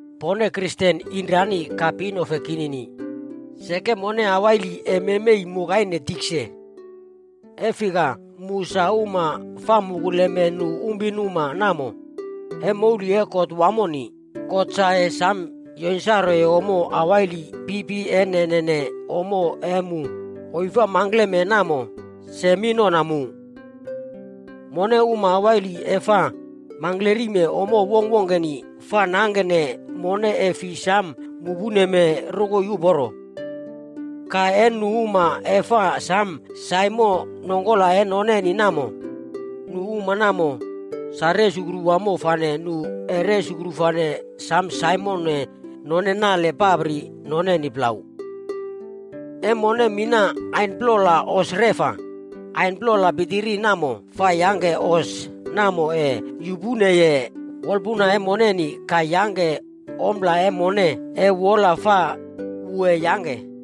Pone Kristen inomranimpi ka pinefe kinini, seke mone mingklari ese maime yukaine tikse. E fika, mu uma fa mukuleme nu pinuma namo, taim e kot wamo, God ese samo yonsane ommo mingklari pitpitiri e nene ommo mu isi mangke ese kotim mu. Mone uma mingklari fa mangke ommo wongkwongkeni fa yangke mone fi samo mupene rokoi uporo. Ka, nu uma fa samo nopane nongkora noneni namo, nu uma nanrona, sa sam uporo wamo ka resukru ese nopane nalpapri noneni plau. E mone mina ain plola hos reꞌfa, ain plola pitpitiri namo fa yangke hos namo yupene wolpuna e mone ka yangke ompla wola mire wu ese yangke.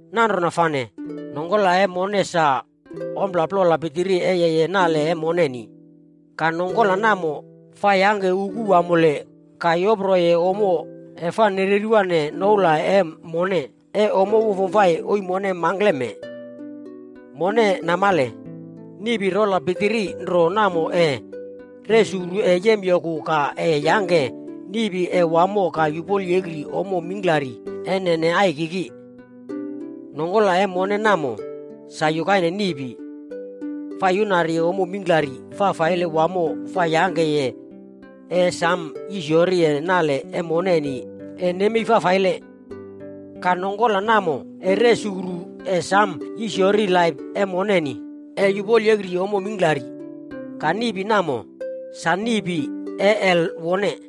Nanrona fane, nongkora e mone sa ompla pitiri plola e yeye nale e mone. Ka nongkora namo fa yangke uku mingklari ka yoproye ommo fa yereriye noula e mone ommo wamo isi mone mangke. Mone namale, niꞌpi rola pitiri nro namo ese yangke niꞌpi wamo ka yisiyori ommo mingklari naine ai. Nongkora e mone namo, wu sa yukaine niꞌpi. Fa yuna ommo mingklari fa samo yangke nale e mone yemei kiina. Ka nongkora namo ese samo yisiyori laip moneni yukaine niꞌpi fa yuꞌpo ommo mingklari. Ka niꞌpi namo, sa niꞌpi e Hel wone.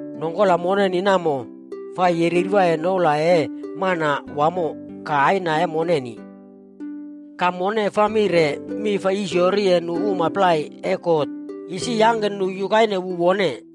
Nongkora moneni namo fa mereri noula e Manawamo ka Aina moneni. Ka mone fa mire mi fa yisiyori nu uma plai e God isi yangke nu yukaine wu wone.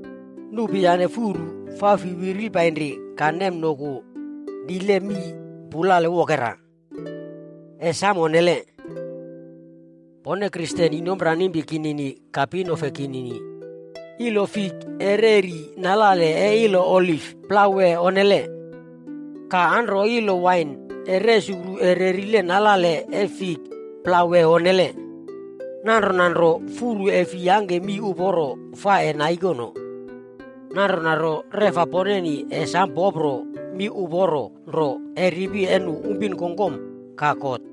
Nupi yane furu fi fa noloni nemnoku naine mii pulale wokera. Sa ese onnele. Pone Kristen inomranimpi ka pinefe kinini, ilo fik ese nalelwa nalale e ilo oliv plau wee onne? Ka anro ilo wain ese nalelwa nalale e ilo fik plau wee onne? Nanrona nro, furu re ese fi yangke mii raulo uporo fa naikonone. Nanrona fane, reꞌfa poneni ese samo popro mi uporo nro e ripi e nu pinuma ka God.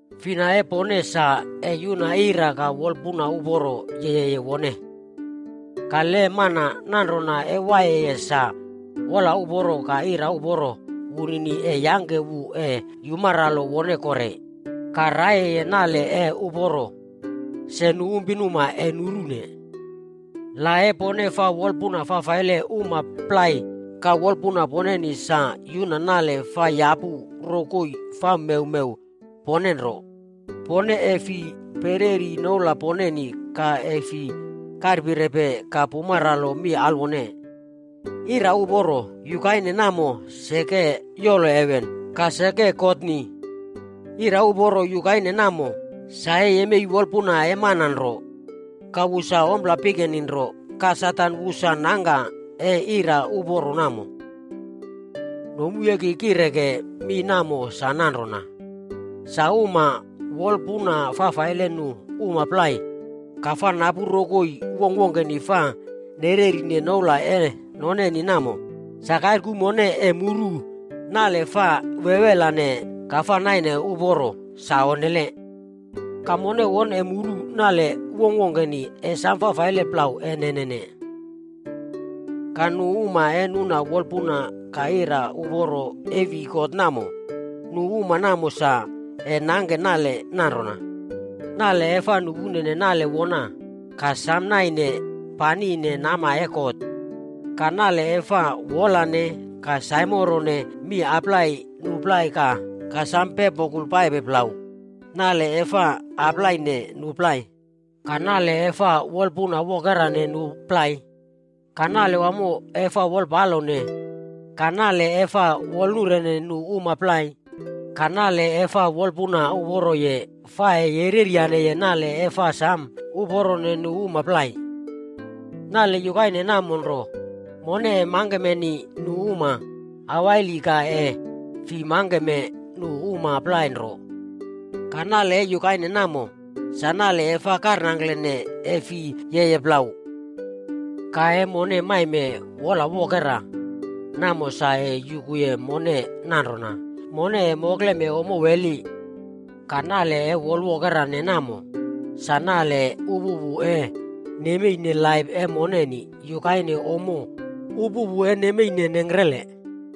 Fina e poneni sa yuna ira ka wolpuna uporo waiye wone? Le mana nanrona waiye sa, wola uporo ka ira wunini ese yangke wu yumaralo ka waraiye nale uporo sa nu pinuma ese nuru. Le pone fa wolpuna fafaile uma plai ka wolpuna poneni sa yuna nale fa yapu rokoi fa mewmew pone nro, pone ese fi pereri noula poneni ka ese fi karpirepe ka pumaralo mi alwone. Ira uporo nanrona seke yolo heven ka seke yolo God. Ira uporo namo sa yemei wolpuna e nu uma nro. Ka wu sa ompla e pikeni fane, ka Satan wu sa yangka ira uporo namo. Nomu e ki kire mi mee sa nanrona, uma fopi fa wolpuna fafaile nu uma plai ka fa napu rokoi wongkwongkeni fa nererine noula noneni namo, sa ningkikaire ese mone muru nale fa wewelane ka fa samo naine uporo namo sa onnele. Ka re ese mone muru nale e wongkwongkeni sam faifaile re ese nenene. Ka nu uma e nem wolpuna ka ira uporo yolowi God, nu uma namo ese nangke nale nanrona: nale e fa samo naine namkire nama e God, sa nale e fa wolane nu plai ka samo nemnoku naine plau, nale e fa wolpalo nu uma plai, ka nale e fa samo wolpunwokera uma plai, ka nale wamo e fa wolyane, ka nale e fa samo wolpalone nu uma plai, ka nale e fa wolpuna uporo fa yangke nale samo uporo uma plai. Nale namo nro, ese mone mangke pai uma mingklari ka ese fi mangke pai uma plai nro. Ka nale namo, fa karnirene sa onnele fi waiye wu. Le mone maime wolpunwokera, namo sa yuku nanrona mone mokle ommo wela. Ka nale e wolpunwokera namo, sa nale uporo laip moneni yukaine ommo uporo e nengkrele.